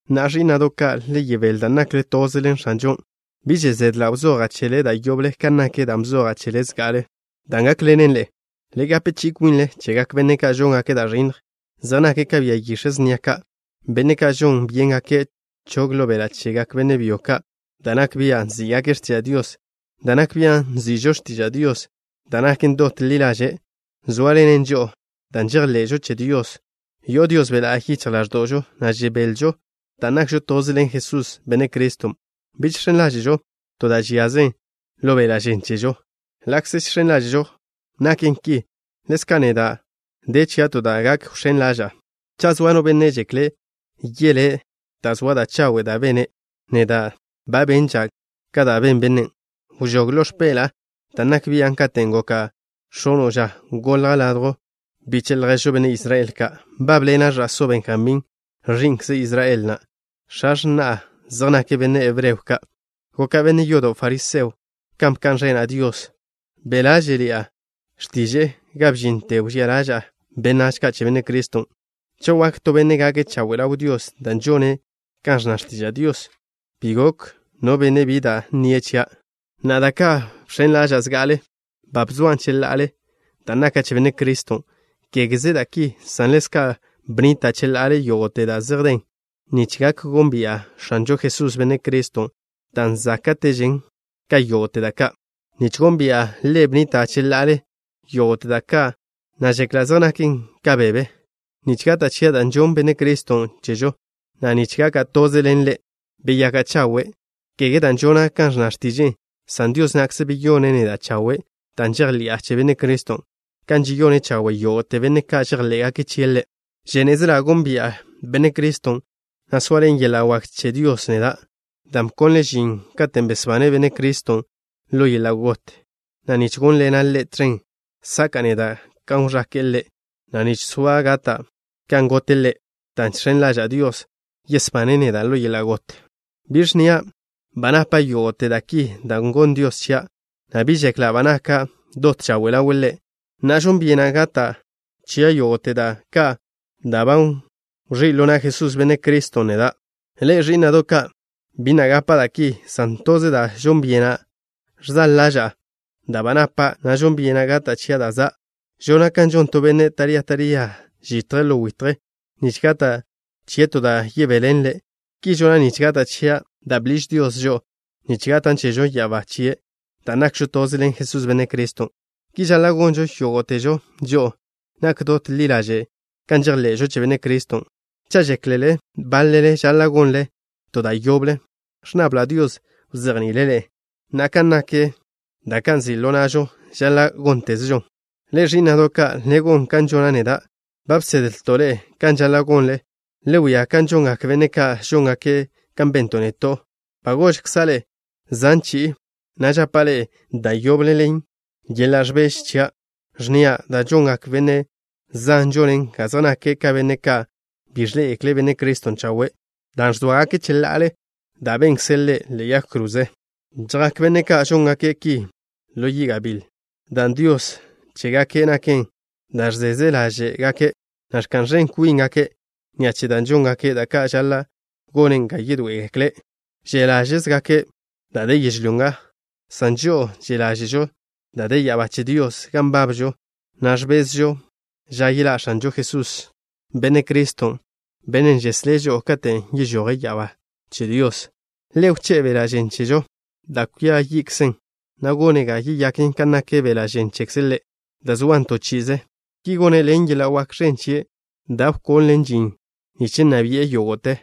Na'a, ẕí'na'do' ka', le yebél dan' nakle toze ḻen X̱anžon'. Bi že' zedla' wzoja' chele da' yoble kan nak dan' bzoja' chele zga'ale, dan' gákḻenen ḻe'e. Le gape chi'i kwinle chegak benne' ka' žóngake' da' ẕinnj. Zej nake' ka bia yix̱e' snia ka', benne' ka' žon byéngake' chog ḻo beḻa' chegak benne' byo ka' da' nak bia' nzí'gake' x̱tiža' Dios. Da' nak bian' nzi'žo x̱tiža' Dios, dan' naken dot ḻi ḻaže', zóaḻenen žo'o. Dan' žejḻe'žo che Dios, yo'o Dios Be' La'y yichj ḻáẕdo'žo, na' žebelžo dan' nakžo toze ḻen Jesús, Benne' Criston'. Bi žx̱en ḻáže'žo to da' žiazen ḻo beḻa' žen chežo. Ḻa'kze žx̱en ḻáže'žo naken ki, ḻezka' neda' de chia' to da' gak wx̱én ḻaža'a. Cha' zoa no benne' žekle' yelé' dan' zoa da' chawe' da' bene', neda' ba benža' ka da' ben bennen': Wžóg ḻo x̱peḻa'a dan' nak bian' katen' goka' x̱ono' ža. Golja' ladjw biche' ljež benne' Israel ka'. Nbábḻena' ẕa'só Benjamín, ẕi'nkze Israel na'. X̱a x̱na'a zej nake' benne' hebreo ka'. Goka' benne' yodo' fariseo kan bka'n ẕena' Dios. Be' ḻáže'ḻi'a x̱tiže'e ga bžinte wžía ḻaža'a benách ka' che Benne' Criston'. Cha' wak to benne' gake' chawe' ḻaw Dios dan' žone' kan ẕnna x̱tiža' Dios, bi gok no benne' bi da' nnie' chia'. Na'a, da ka' bx̱en ḻaža'a zga'ale, ba bzoan' cheḻa'ale dan' naka' che Benne' Criston'. Kégeze da' ki, san ḻezka' bnnita' cheḻa'ale yógo'te da' zej den, nich gak gónbi'a X̱anžo Jesús, Benne' Criston', dan' záka'težen ka yógo'te da' ka'. Nich gónbi'a Ḻe' bnnita' cheḻa'ale yógo'te da' ka', na' žekla' zej naken ka bebe, nich gata' chia' da' žonn Benne' Criston' chežo, na' nich gaka' toze ḻen Ḻe'. Beyaka' chawe', kege dan' žona' kan ẕnna x̱tiže'e, san Dios na'kze beyone' neda' chawe' dan' žejḻi'a che Benne' Criston', kan žeyone' chawe' yógo'te benne' ka' žejḻé'gake' chie' Ḻe'. Žénezela' gónbi'a Benne' Criston', na' soaḻen yeḻa' wak che Dios neda', dan' bkonle' žin katen' besbane' Benne' Criston' ḻo yeḻa' got, na' nich gónḻena' Ḻe' tẕen, saka'a neda' kan wẕake'e Ḻe', na' nich soa' gata' kan gote' Ḻe', dan' žx̱en ḻaža'a Dios, yesbane' neda' ḻo yeḻa' got. Bi ẕnnia' ba napa' yógo'te da' ki da' gonn Dios chia', na' bi žekla' ba naka' dot chawe' ḻawe' Ḻe'. Na'a, žon byena' gata' chia' yógo'te da' ka' dan' ba wẕí' ḻo na' Jesús, Benne' Criston', neda'. Ḻe'e, ẕí'na'do' ka', bi na' gapa' da' ki, san toze da' žon byena'. Ẕzaḻ ḻaža'a da' ba napa', na' žon byena' gata' chia' da' za'. Žona' kan žon to benne' taría taría žitje' ḻo witje nich gata' chie' to da' yebéḻenle'. Ki žona' nich gata' chia' da' bḻiž Dios žo'o nich gatan' chežo ya'abá chie' dan' nakžo toze ḻen Jesús, Benne' Criston'. Ki žaḻa' gonžo yógo'težo žo'o, nak dot ḻi ḻaže' kan žejḻe'žo che Benne' Criston'. Cha' žéklele báḻele žaḻa' gonle to da' yoble, ẕnnabla' Dios wzejni'ile' ḻe'e. Na'a, kan nak da' ba nzi' ḻo na'žo, žaḻa' góntezežon. Ḻe'e, ẕí'na'do' ka', le gon kan žona' neda'. Ba bsedlto' ḻe'e kan žaḻa' gonle. Le wia kan žongak benne' ka' žóngake' kan bento' neto'. Ba gožkza' ḻe'e zan chi'i, na' žapa' ḻe'e da' yoble ḻen yeḻa' ẕbeže chia', ẕnnia': da' žongak benne' zan žonen ga zej nake' ka benne' ka' bi ẕḻé'egekle' Benne' Criston' chawe', dan' ẕzóagake' cheḻa'ale da' benkze' Ḻe' ḻe'e yag kroze. Chjak benne' ka' žóngake' ki ḻo yi' gabíl dan' dios chégake' naken da' ẕzeze ḻáže'gake', na' ẕka'n ẕen kwíngake' ni'a che da' žóngake', da' ka' žaḻa' gonen ga yedoé'egekle'. Že' ḻáže'zegake' da' de yežlyó nga, san žo'o že' ḻáže'žo da' de ya'abá che Dios gan nbabžo, na' ẕbezžo ža yeḻá' X̱anžo Jesús, Benne' Criston', Bennen' žeslé' žo'o, katen' yežoje' ya'abá che Dios. Ḻe' wché'e beḻa' žen chežo, da' kwia yi'kzen, na' gone' ga yeyaken kan nak beḻa' žen chekze' Ḻe', da' soan to chi'ize. Ki gone' ḻen yeḻa' wak ẕen chie' da' wkonle' žin nich nna bi'e yógo'te.